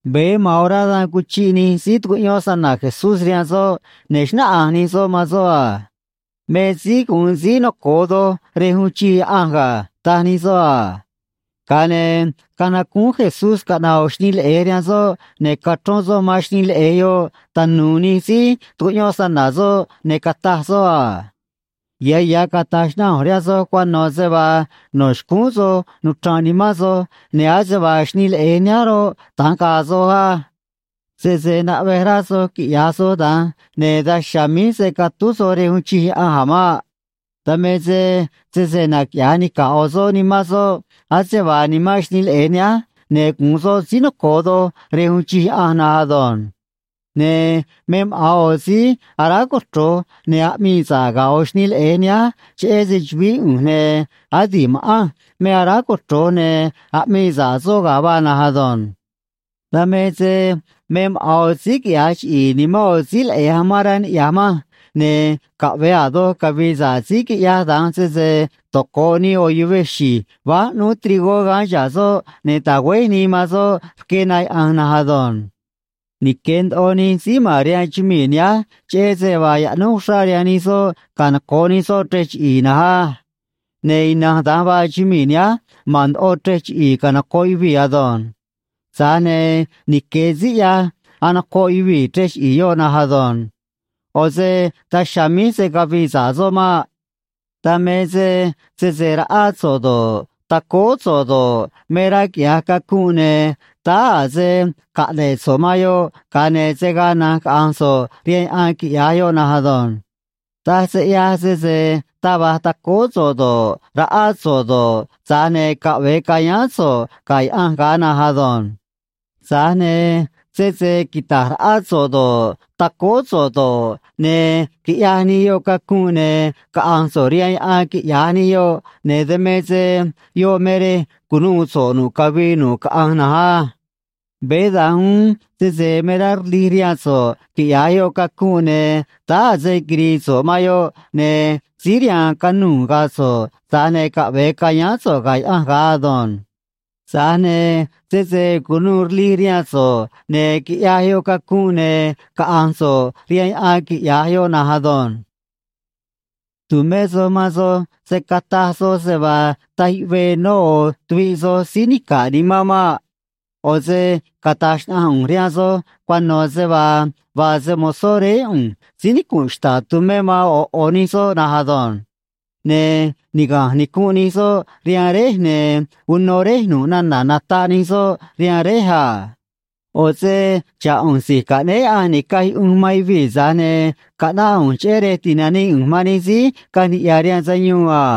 Veé ma̱an orá dan cuchiꞌ nij síí tucuꞌyón snana̱ Jesús rihaan soꞌ, ne̱ xnáꞌanj nij soꞌ man soꞌ a: ―Me síí gu̱un síí noco̱o doj rej uun chij Yaꞌanj ga̱ ―taj nij soꞌ a. Ga̱a ne̱ canacúún Jesús caꞌna̱ꞌ ꞌo̱ xnii leꞌe̱j rihaan soꞌ, ne̱ cachrón soꞌ man xnii leꞌe̱j yoꞌ tanu̱u̱ nij síí tucuꞌyón snana̱ soꞌ, ne̱ cataj soꞌ a: ―Ya̱ ya̱ cata̱j xnaꞌanj ꞌu̱nj rihaan soj cuano̱ se vaa no̱ xcúún soj nuchra̱nꞌ nimán soj, ne̱ ase vaa xnii leꞌe̱j nihánj roꞌ, da̱nj ga̱a̱ soj á. Sese naꞌvej rá soj quiꞌya̱j soj da̱nj, ne̱ daj chiha̱a̱ míj se̱ catúj soj rej uun chij Yaꞌanj a̱ maꞌ. Dan me se sese naquiꞌya̱j nica̱ꞌ ꞌo̱ soꞌ nimán soꞌ ase vaa nimán xnii leꞌe̱j nihánj, ne̱ gu̱un soꞌ síí noco̱o doj rej uun chij Yaꞌanj na̱nj ado̱nj. Ne̱ me maꞌa̱n ꞌo̱ síí aráj cochro̱j ne̱ aꞌmii sa̱ꞌ ga̱ ꞌo̱ xnii leꞌe̱j nihánj cheꞌé se‑chu̱vií ꞌu̱nj, ne̱ adi̱ꞌ ma̱ꞌanj me aráj cochro̱j ne̱ aꞌmii sa̱ꞌ soꞌ ga̱ vaa na̱nj ado̱nj. ’Dan me se me maꞌa̱n ꞌo̱ síí quiꞌya̱j chiꞌi̱i̱ nimán ꞌo̱ síí leꞌe̱j amán rá niꞌya̱j manj, ne̱ caꞌve̱e a̱ doj cavi̱i̱ sa̱ꞌ síí quiꞌyaj da̱nj sese toco̱ꞌ nii ꞌo̱ yuvej xi̱j váj ꞌnúú trigó gaán chihá soꞌ ne̱ ta̱güéj nii man soꞌ rque na yaꞌa̱nj na̱nj ado̱nj. Nique̱ ndoꞌo nij síí ma̱n rihaan chumii̱ nihánj, cheꞌé se vaa yaꞌnúj uxrá rihaan nij soꞌ canoco̱ꞌ nij soꞌ chrej chiꞌi̱i̱ na̱nj á. Ne̱ ina̱nj da̱nj vaa chumii̱ nihánj, ma̱n ndoꞌo chrej chiꞌi̱i̱ canoco̱ꞌ yuvii̱ ado̱nj. Tza̱j ne̱ nique̱ síí ꞌyaj anocoꞌ yuvii̱ chrej chiꞌi̱i̱ yoꞌ na̱nj ado̱nj. ꞌO̱ se daj chiha̱a̱ míj se̱ cavii sa̱ꞌ soꞌ maꞌ. ’Dan me se sese raꞌá so̱ꞌ do̱ꞌ, tacóó so̱ꞌ do̱ꞌ, me rá quiꞌya̱j cacunꞌ, ne̱ táá a̱ se caꞌne̱ꞌ so̱ꞌ man yoꞌ, ga̱a ne̱ se̱ gaa na̱nj caꞌa̱nj so̱ꞌ rihaan yaꞌan quiꞌya̱j yoꞌ na̱nj ado̱nj. Taj se ꞌyaj sese taj va̱j tacóó so̱ꞌ do̱ꞌ, raꞌá so̱ꞌ do̱ꞌ, tza̱j ne̱ caꞌve̱e ca̱yáán so̱ꞌ ga̱ Yaꞌanj ga̱a na̱nj ado̱nj. Tza̱j ne̱ sese quita̱j raꞌá so̱ꞌ do̱ꞌ, tacóó so̱ꞌ do̱ꞌ, ne̱ quiꞌyaj nij yoꞌ cacunꞌ, ne̱ caꞌa̱nj so̱ꞌ rihaan yaꞌan, quiꞌya̱j nij yoꞌ, ne̱ dan me se yoꞌ me rej cu̱nuû so̱ꞌ nu̱ꞌ cavii nu̱ꞌ caꞌanj na̱nj á. Veé da̱nj uún sese me rá rlij rihaan so̱ꞌ quiꞌya̱j yoꞌ cacunꞌ, ne̱ táá a̱ se quiri̱i̱ so̱ꞌ man yoꞌ, ne̱ síí rihaan canuu̱ ga̱a̱ so̱ꞌ, tza̱j ne̱ caꞌve̱e ca̱yáán so̱ꞌ ga̱ Yaꞌanj ga̱a ado̱nj. Tza̱j ne̱ sese cu̱nuû rlij rihaan so̱ꞌ ne̱ quiꞌyaj yoꞌ cacunꞌ, ne̱ caꞌa̱nj so̱ꞌ rihaan yaꞌan, quiꞌya̱j yoꞌ na̱nj ado̱nj. ’Tu̱mé soj man soj se̱ cataj soj se vaa taj yuꞌvee nó ꞌo̱ tuviꞌ soj síí nica̱ꞌ nimán maꞌ. ꞌO̱ se cata̱j xnaꞌanj ꞌu̱nj rihaan soj cuano̱ se vaa vaa se‑mo̱zó Réé ꞌu̱nj síí nicu̱nꞌ xta̱ꞌ tumé man ꞌo̱ ꞌo̱ nij soꞌ na̱nj ado̱nj. Ne̱ niga̱nj nicunꞌ nij soꞌ rihaan Réj, ne̱ uno Réj nu̱ꞌ nana̱ nataꞌ nij soꞌ rihaan Réj a. ꞌO̱ se xa̱ꞌ ꞌu̱nj Si̱j Caꞌnéé Yaꞌanj Ni̱caj Yuꞌunj man Yuvii̱, tza̱j ne̱ caꞌnáꞌ ꞌu̱nj cheꞌé rej ti̱nanii ꞌu̱nj man nij síí caꞌanj niꞌya̱ rihaan sayuun a.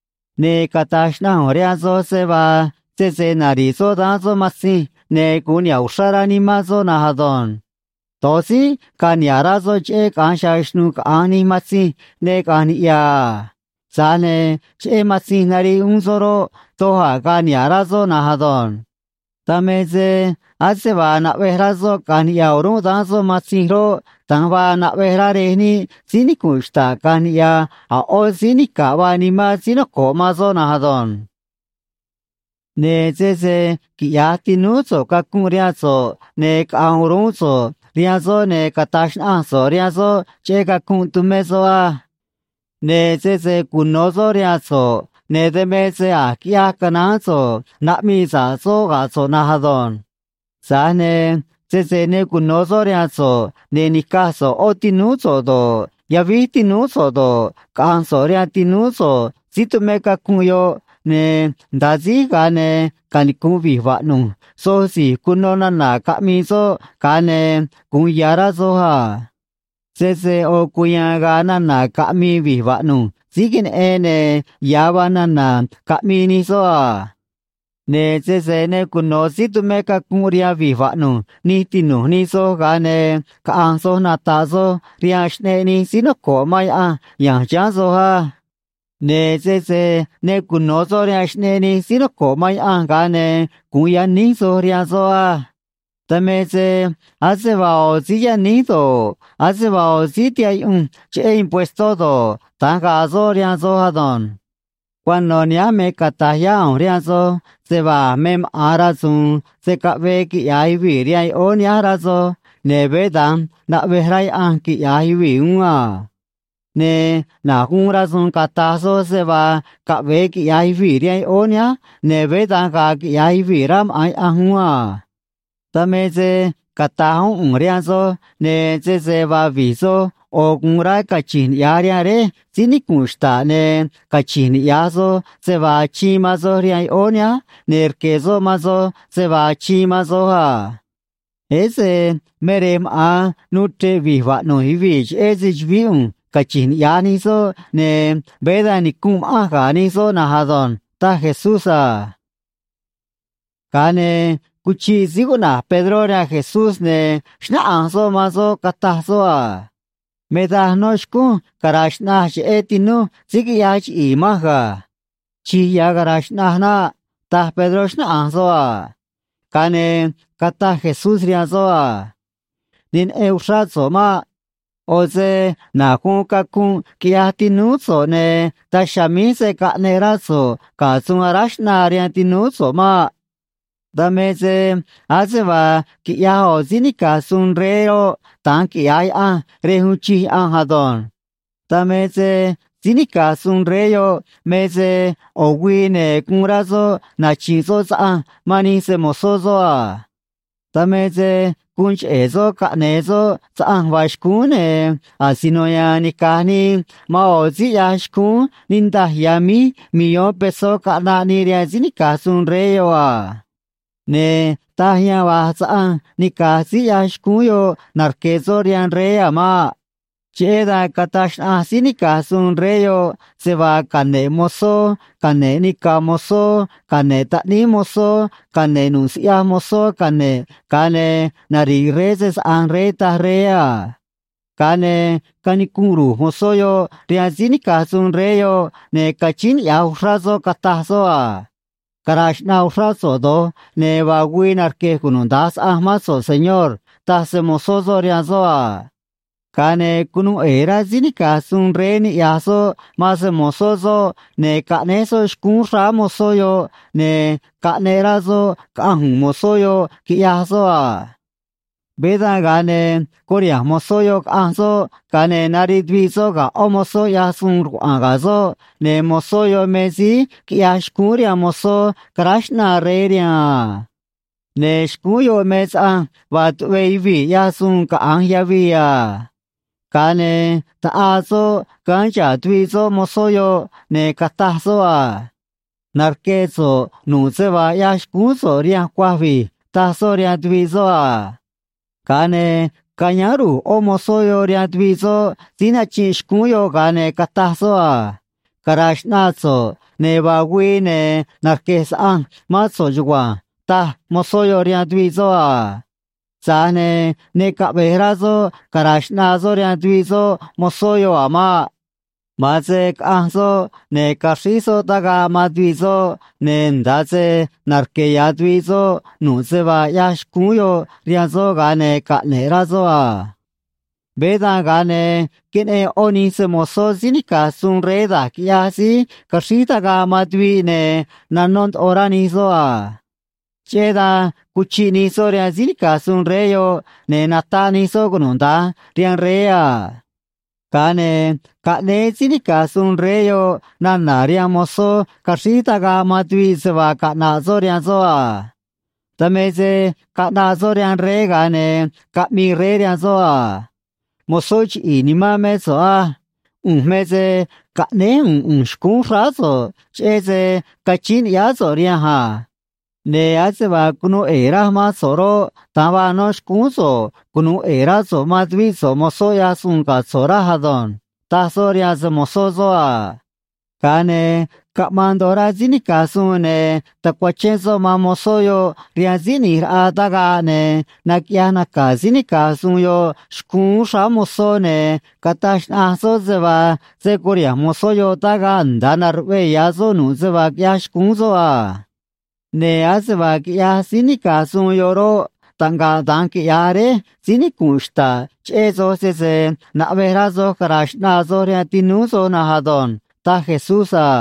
Ne̱ cata̱j xnaꞌanj ꞌu̱nj rihaan soj se vaa sese nari̱ꞌ soꞌ daán soꞌ matzinj, ne̱ gu̱un niha̱ꞌ uxrá rá nimán soꞌ na̱nj ado̱nj. Do̱j tzínꞌ ga̱a̱ niha̱ꞌ rá soꞌ cheꞌé caꞌa̱nj chiha̱a̱ xnu̱ꞌ caꞌa̱nj nij matzinj ne caꞌa̱nj niꞌya̱ a. Tza̱j ne̱ cheꞌé matzinj nariꞌ uún soꞌ roꞌ, doj a̱ ga̱a̱ niha̱ꞌ rá soꞌ na̱nj ado̱nj. Dan me se ase vaa naꞌvej rá soꞌ caꞌa̱nj niꞌya̱ o̱rúnꞌ daán soꞌ matzinj roꞌ, da̱nj vaa naꞌvej rá Rej níꞌ síí nicu̱nꞌ xta̱ꞌ caꞌa̱nj niꞌya̱ a̱ ꞌó síí nica̱ꞌ vaa nimán síí noco̱ꞌ man soꞌ na̱nj ado̱nj. ’Ne̱ sese quiꞌya̱j tinúú so̱ꞌ cacunꞌ rihaan so̱ꞌ, ne̱ caꞌa̱nj o̱rúnꞌ so̱ꞌ rihaan soꞌ, ne̱ cata̱j xnaꞌanj so̱ꞌ rihaan soꞌ cheꞌé cacunꞌ tumé soꞌ á. Ne̱ sese cuno̱ soꞌ rihaan so̱ꞌ, ne̱ dan me se a̱j quiꞌyaj canaán so̱ꞌ naꞌmii sa̱ꞌ soꞌ ga̱ so̱ꞌ na̱nj ado̱nj. Tza̱j ne̱ sese ne cuno̱ soꞌ rihaan so̱ꞌ ne̱ ni̱caj so̱ꞌ ꞌó tinúú so̱ꞌ do̱ꞌ, yavíj tinúú so̱ꞌ do̱ꞌ, caꞌa̱nj so̱ꞌ rihaan tinúú so̱ꞌ síí tumé cacunꞌ yoꞌ, ne̱ nda̱a síj, ga̱a ne̱ canicu̱nꞌ vi̱j vaꞌnu̱j soj si̱j cuno̱ nana̱ caꞌmi̱i̱ soꞌ, ga̱a ne̱ gu̱un ya̱ rá soj a. Sese ꞌo̱ cuya̱a̱n ga̱a̱ nana̱ caꞌmi̱i̱ vi̱j vaꞌnu̱j síí queneꞌen, ne̱ ya̱ vaa nana̱ caꞌmii nij soꞌ a. Ne̱ sese ne cuno̱ síí tumé cacunꞌ rihaan vi̱j vaꞌnu̱j nij tinu̱j nij soj, ga̱a ne̱ caꞌa̱nj soj nata̱ꞌ soj rihaan xꞌneꞌ nij síí noco̱ꞌ man Yaꞌanj ya̱nj chiháán soj á. Ne̱ sese ne cuno̱ soꞌ rihaan xꞌneꞌ nij síí noco̱ꞌ man Yaꞌanj, ga̱a ne̱ gu̱un yaníj soj rihaan soꞌ á. Dan me se ase vaa ꞌo̱ síí yaníj do̱ꞌ, ase vaa ꞌo̱ síí tihaꞌ yuꞌunj cheꞌé impuestó do̱ꞌ, da̱nj ga̱a̱ soꞌ rihaan soj ado̱nj. ’Cuano̱ nihánj me cata̱j yá ꞌu̱nj rihaan soj se vaa a̱ me maꞌa̱n rasu̱u̱n se̱ caꞌvee quiꞌya̱j yuvii̱ rihaan yoꞌóó nihánj rá soj, ne̱ veé da̱nj naꞌvej rá Yaꞌanj quiꞌya̱j yuvii̱ uún a. Ne̱ na̱j guun rasu̱u̱n cata̱j soj se vaa caꞌve̱e quiꞌya̱j yuvii̱ rihaan yoꞌóó nihánj, ne̱ veé da̱nj ga̱a̱ quiꞌya̱j yuvii̱, rá maꞌa̱n Yaꞌanj uún a. ’Dan me se cata̱j uún ꞌu̱nj rihaan soj, ne̱ sese vaa vi̱j soj ꞌo̱ gu̱un rá cachi̱nj niꞌya̱j rihaan Réj síí nicu̱nꞌ xta̱ꞌ, ne̱ cachi̱nj niꞌya̱j soj se vaa achiin man soj rihaan yoꞌóó nihánj, ne̱ rque̱ soꞌ man soj se vaa achiin man soj a. Ese me rej maꞌa̱n nuu chre̱ꞌ vi̱j vaꞌnu̱j yuvii̱ cheꞌé se‑chu̱vií ꞌu̱nj cachi̱nj niꞌya̱j nij soꞌ, ne̱ veé da̱nj nicu̱nꞌ ma̱ꞌanj ga̱ nij soꞌ na̱nj ado̱nj ―taj Jesús a. Ga̱a ne̱ cuchiꞌ síí cuꞌna̱j Pedró rihaan Jesús, ne̱ xnáꞌanj soꞌ man soꞌ, cataj soꞌ a: ―Me daj nó xcúnj cara̱a̱ xꞌnaj cheꞌé tinúj síí quiꞌyaj chiꞌi̱i̱ manj ga̱. Chi̱j ya̱ cara̱a̱ xꞌnaj naꞌ ―taj Pedró, xnáꞌanj soꞌ a. Ga̱a ne̱ cataj Jesús rihaan soꞌ a: ―Ne neꞌen uxrá so̱ꞌ maꞌ. ꞌO̱ se na̱j guun cacunꞌ quiꞌyaj tinúú so̱ꞌ, ne̱ daj chiha̱a̱ míj se̱ caꞌneꞌ rá so̱ꞌ ga̱ suun aráj xꞌnaa rihaan tinúú so̱ꞌ maꞌ. ’Dan me se ase vaa quiꞌyaj ꞌo̱ síí nica̱j suun rey roꞌ, da̱nj quiꞌya̱j Yaꞌanj rej uun chij Yaꞌanj ado̱nj. Dan me se síí nica̱j suun rey yoꞌ me se ꞌo̱ güii, ne̱ guun rá soꞌ nachi̱nꞌ soꞌ saꞌanj man nij se‑mo̱zó soꞌ a. Dan me se guun cheꞌe̱ soꞌ caꞌne̱e̱ soꞌ saꞌanj vaa xcúún, ne̱ asino ya̱a̱n nica̱j nii man ꞌo̱ síí ꞌyaj xcúún niꞌndaj ya̱ míj millón pesó caꞌnaꞌ nii rihaan síí nica̱j suun rey yoꞌ a. Ne̱ taj yan va̱j saꞌanj nica̱j síí ꞌyaj xcúún yoꞌ narque̱ soꞌ rihaan rey a̱ maꞌ. Cheꞌé dan cataj xnaꞌanj síí nica̱j suun rey yoꞌ se vaa cane̱ꞌ mozó cane̱ꞌ nica̱ mozó cane̱ꞌ taꞌníí mozó cane̱ꞌ nu̱ꞌ siꞌyaj mozó cane̱ꞌ, ga̱a ne̱ nari̱ꞌ rey se‑saꞌa̱nj rey, taj rey a. Ga̱a ne̱ canicunꞌ ru̱j mozó yoꞌ rihaan síí nica̱j suun rey yoꞌ, ne̱ cachíín niꞌya̱j uxrá soꞌ, cataj soꞌ a: “Cara̱a̱ xꞌnaa uxrá so̱ꞌ do̱j, ne̱ vaa güii narque̱j cunuda̱nj saꞌanj mán so̱ꞌ, señor”, taj se‑mo̱zó soꞌ rihaan soꞌ a. Ga̱a ne̱ cunuu ꞌe̱e̱ rá síí nica̱j suun rey niꞌya̱j soꞌ man se‑mo̱zó soꞌ, ne̱ caꞌnéj soꞌ xcúún xráá mozó yoꞌ, ne̱ caꞌneꞌ rá soꞌ, caꞌanj u̱u̱n mozó yoꞌ, quiꞌyaj soꞌ a. ’Veé dan, ga̱a ne̱ curiha̱nj mozó yoꞌ, caꞌanj soꞌ, ga̱a ne̱ nariꞌ tuviꞌ soꞌ ga̱ ꞌó mozó ꞌyaj suun rcuaꞌa̱a̱n ga̱ soꞌ, ne̱ mozó yoꞌ me síí quiꞌyaj xcúún rihaan mozó caráj xꞌnaa rey rihaan a. Ne̱ xcúún yoꞌ me saꞌanj vaa tuꞌvee yuvii̱ ꞌyaj suun caꞌa̱nj yavii a. Ga̱a ne̱ taꞌaa soꞌ gaán chihá tuviꞌ soꞌ mozó yoꞌ, ne̱ cataj soꞌ a: “Narque̱ so̱ꞌ nu̱ꞌ se vaa ꞌyaj xcúún so̱ꞌ rihanj cuaj vi̱j”, taj soꞌ rihaan tuviꞌ soꞌ a. Ga̱a ne̱ cayáán ru̱j ꞌó mozó yoꞌ rihaan tuviꞌ soꞌ síí nachinꞌ xcúún yoꞌ, ga̱a ne̱ cataj soꞌ a: “Cara̱a̱ xꞌnaa so̱ꞌ, ne̱ vaa güii, ne̱ narque̱j saꞌanj mán so̱ꞌ chugua̱nj”, taj mozó yoꞌ rihaan tuviꞌ soꞌ a. Tza̱j ne̱ ne caꞌve̱j rá soꞌ cara̱a̱ xꞌnaa soꞌ rihaan tuviꞌ soꞌ mozó yoꞌ a̱ maꞌ. Ma̱an se caꞌanj soꞌ, ne̱ caxríj soꞌ tagaꞌ man tuviꞌ soꞌ, ne̱ nda̱a se narque̱ ya̱ tuviꞌ soꞌ nu̱ꞌ se vaa ꞌyaj xcúún yoꞌ rihaan soꞌ, ga̱a ne̱ caꞌne̱ꞌ rá soꞌ a. ’Veé dan, ga̱a ne̱ queneꞌen ꞌó nij se‑mo̱zó síí nica̱j suun rey da̱j quiꞌyaj síí caxríj tagaꞌ man tuviꞌ, ne̱ nanó ndoꞌo rá nij soꞌ a. Cheꞌé dan cuchiꞌ nij soꞌ rihaan síí nica̱j suun rey yoꞌ, ne̱ nataꞌ nij soꞌ cunuda̱nj rihaan rey a. Ga̱a ne̱ caꞌnéé síí nica̱j suun rey yoꞌ nana̱ rihaan mozó caxríj tagaꞌ man tuviꞌ se vaa caꞌna̱ꞌ soꞌ rihaan soꞌ a. Dan me se caꞌnaꞌ soꞌ rihaan rey, ga̱a ne̱ caꞌmii rey rihaan soꞌ a: “Mozó chiꞌi̱i̱ nimán mé so̱ꞌ á. ꞌU̱nj me se caꞌnéj u̱u̱n ꞌu̱nj xcúún xráá so̱ꞌ, cheꞌé se cachíín ni̱ꞌyáá so̱ꞌ rihanj a. Ne̱ ase vaa cunuu ꞌe̱e̱ raj mán so̱ꞌ roꞌ, da̱nj vaa no̱ xcúún so̱ꞌ cunu̱u ꞌe̱e̱ rá so̱ꞌ man tuvíꞌ so̱ꞌ mozó ꞌyaj suun ga̱ so̱ꞌ raj ado̱nj”, taj soꞌ rihaan se‑mo̱zó soꞌ a. Ga̱a ne̱ caꞌmaan ndoꞌo rá síí nica̱j suun, ne̱ tacuachén soꞌ man mozó yoꞌ rihaan síí ꞌni̱j raꞌa tagaꞌ, ne̱ naquiꞌyaj naca̱ síí nica̱j suun yoꞌ xcúún xráá mozó, ne̱ cataj xnaꞌanj soꞌ se vaa se̱ curiha̱nj mozó yoꞌ tagaꞌ nda̱a na̱ruꞌvee ya̱ soꞌ nu̱ꞌ se vaa quiꞌyaj xcúún soꞌ a. ’Ne̱ ase vaa quiꞌyaj síí nica̱j suun yoꞌ roꞌ, taꞌngaꞌ da̱nj quiꞌya̱j Réj síí nicu̱nꞌ xta̱ꞌ cheꞌé soj, sese naꞌvej rá soj cara̱a̱ xꞌnaa soj rihaan tinúú soj na̱nj ado̱nj ―taj Jesús a.